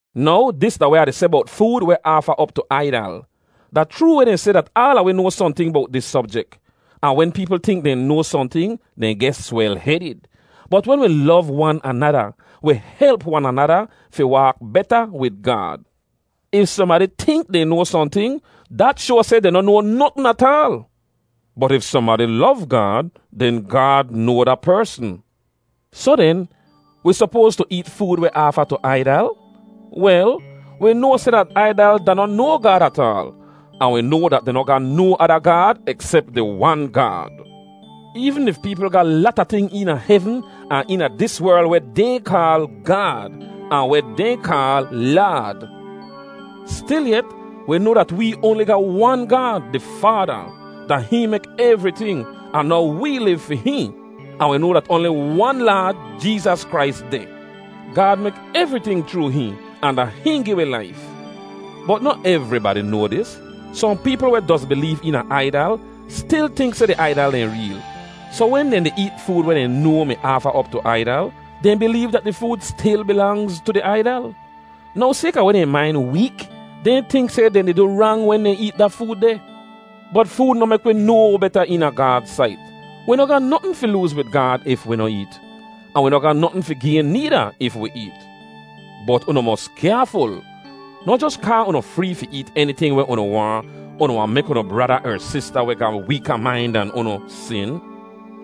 Now dis da weh Ah di seh bowt food weh aafa op tu aidal: Da chroo weh dehn seh dat aala wi noa sohnting bowt dis sobjek. Ahn wen peepl tink dehn noa sohnting, dehn geh swel-hedid. Bot wen wi lov wan anada, wi help wan anada fi waak beta wid Gaad. If sohnbadi tink dehn noa sohnting, dat shoa seh dehn noh noa notn ataal. Bot if sohnbadi lov Gaad, den Gaad noa da persn. Soh den, wi sopoas tu eet food weh aafa tu aidal? Wel, wi noa seh dat aidal da noh no gaad ataal. Ahn wi noa dat dehn noh ga no ada gaad eksep di wan Gaad. Eevn if peepl ga lata ting eena hevn ahn eena dis werl weh dehn kaal “gaad,” ahn weh dehn kaal “laad,” stilyet, wi noa dat wee oanli ga wan Gaad, di Faada. Da hihn mek evriting, ahn now wee liv fi hihn. Ahn wi noa dat oanli wan Laad, Jeezas Krais, deh. Gaad mek evriting chroo hihn, ahn da hihn gi wi laif. Bot noh evribadi noa dis. Sohn peepl weh doz bileev eena aidal stil tink seh di aidal dehn reel, soh wen dehn di eet food weh dehn noa mi aafa op tu aidal, dehn bileev dat di food stil bilangz tu di aidal. Now sayka weh dehn main week, dehn tink seh dehn di du rang wen dehn eet da food deh. Bot food noh mek wi no beta eena Gaad sait. Wi noh ga notn fi looz wid Gaad if wi noh eet. Ahn wi noh ga notn fi gayn needa if wi eet. Bot unu mos kyaaful. Noh jos kaa unu free fi eet eniting weh unu waahn, unu wahn mek unu brada er sista weh ga weeka main dan unu sin.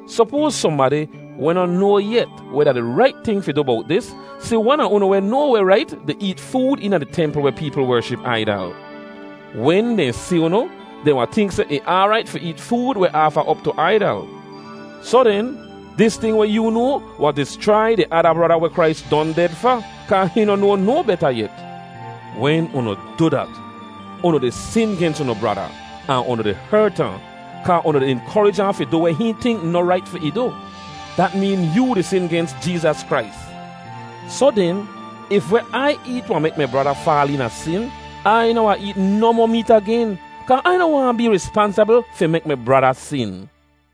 Sopoaz sohnbadi, weh noh noa yet weh da di rait ting fi du bowt dis, si wan a unu weh noa weh rait di eet food eena di templ weh peepl wership aidal? Wen dehn si unu, dehn wahn tink seh ih aarait fi eet food weh aafa op tu aidal. Soh den, dis ting weh yoo noa wahn dischrai di ada brada weh Krais don ded fa, kaa hihn noh noa no beta yet. Wen unu du dat, unu di sin gens unu brada, ahn unu di hert ahn, kaa unu di inkorij ahn fi du weh hihn tink noh rait fi ih du. Dat meen yoo di sin gens Jeezas Krais. Soh den, if weh Ai eet wahn mek mi brada faal eena sin, Ai noh wahn eet nohmoh meet agen, kaa Ai noh waahn bee rispansabl fi mek mi brada sin.